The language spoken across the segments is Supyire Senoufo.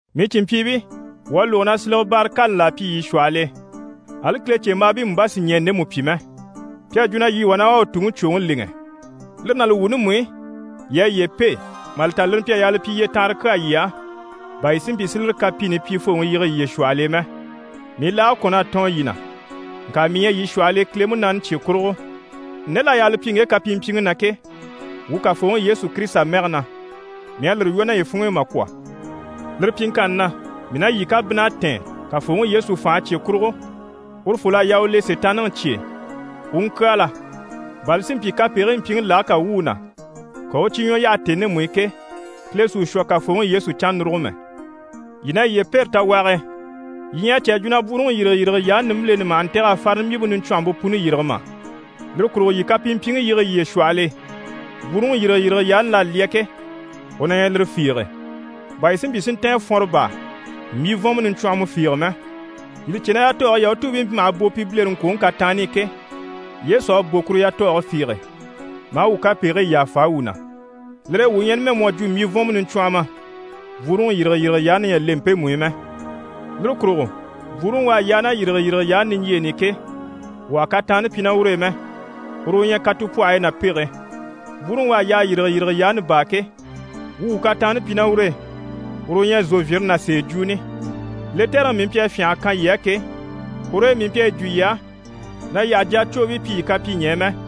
Mii cìnmpyiibii, wuu à lógo na silegebaara kani là à pyi yii shwɔhɔl'e, ali Kilecembaabii mú bà sì ɲɛɛ ndemu pyi mɛ. Pi à jwo na yii wà na wá a u tuŋi cwoŋi lèŋɛ. Lire ná li wuuni mú i, yii à yiye pêe, mà li ta lire mpyi a yaa li pyi yyetanhara kyaa yii á, bà yii si mpyi si lire kapiini pyifooŋi yige yiye shwɔhɔl'e mɛ. Mii laage kɔn'à tɔɔn yii na, ŋka mii ɲyɛ yii shwɔhɔl'e Kile Munaani cye kurugo. Nde l'à yaa li pyi ŋge kapimpyiŋi na ke, wuu Kafooŋi Yesu Kirisita mɛge na, mii à lire lwɔ́ naye funŋ'i mà kwɔ̀. Lire pyiŋkanni na, mii ná yii ká bínn'a tɛ̀ɛn, Kafooŋi Yesu fànhe cye kurugo, urufol'à yaa u le Sitaanniŋi cye e, u u ŋkyaala, bà li si mpyi kapegigii mpyiŋi lage ká wwû u na, ka u u cyi ɲwɔ yaha tèni ndemu i ke, Kile si u shwɔ Kafooŋi Yesu cannuruge mɛ. Yii na yiye pêre tawage e, yii ɲyɛ a cè a jwo na: «bwúuruŋi yîrigeyirige yaani nimbileni maha ntɛ̀g'a farani mbyìmpe niɲcwɔnhɔmpe puni yîrige» mà? Lire kurugo yii kapimpyiŋi yige yiye shwɔhɔl'e, bwúuruŋi yîrigeyirige yaani l'à lyɛ ke, u na ɲyɛ lire fiige, bà yii si mpyi si ntɛ̀ɛn fwɔnrɔ baa mbyìvɔnmɔ niɲcwɔnhɔmɔ fiige mɛ. Yii li cè na yatɔɔge Yahutuubii mpyi maha bò pi bilereŋkwoŋi kataanni i ke, Yesu à bò kuru yatɔɔge fiige, maa wuu kapegigii yàfa wuu na. Lire e wuu ɲyɛ numɛ mu à jwo mbyìvɔnmɔ niɲcwɔnhɔmɔ, bwúuruŋi yîrigeyirige yaani ɲyɛ a le mpemu i mɛ. Lire kurugo bwúuruŋi u à yaa ná yîrigeyirige yaani niɲjyeeni i ke, wuu àha kataanni pyi ná ur'e mɛ, uru u ɲyɛ katupwɔhɔyi ná pege. Bwúuruŋi u à yaa yîrigeyirige yaani baa ke, wuu wuu kataanni pyi ná ur'e, uru u ɲyɛ zòvyinre ná sèejwuuni. Lɛtɛrɛŋi mii à fyânha a kan yii á ke, ur'e mii mpyi a yi jwo yii á na yii àha jacwoobii pyi yii kapyiɲɛɛ mɛ.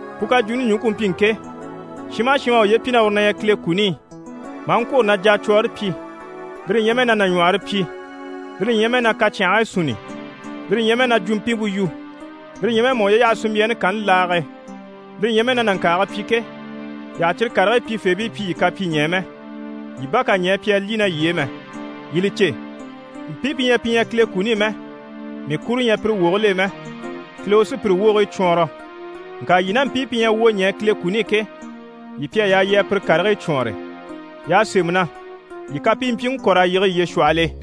Pu kajwuuni ɲùŋke ku mpyi ŋke: shin maha shin u à uye pyi na uru na ɲyɛ Kile kuni i, maa ŋkwôro na jacwɔɔre pyi, lire ɲyɛ mɛ na nàɲwɔhɔre pyi, lire ɲyɛ mɛ na kacyanhigii sunni, lire ɲyɛ mɛ na jwumpimpe yu, lire ɲyɛ mɛ mà uye yaha sinmbyaani kanni laage e, lire ɲyɛ mɛ na nàŋkaage pyi ke, yii àha cyire karigii pyifeebii pyi yii kapyiɲɛɛ mɛ, yii bá kà ɲɛɛ pi a lyî ná yii e mɛ. Yii li cè, mpii pi ɲyɛ pi ɲyɛ Kile kuni i mɛ, mii kuro ɲyɛ pire wogigil'e mɛ, Kile u sí pire wogigii cwɔɔnrɔ. Ŋka yii ná mpii pi ɲyɛ wwoɲɛɛ Kile kuni i ke, yii pi à yaa yii a pire karigii cwɔɔnre. Y'à sémɛ na: «Yii kapimpyiŋi kɔ̀r'a yige yiye shwɔhɔl'e.»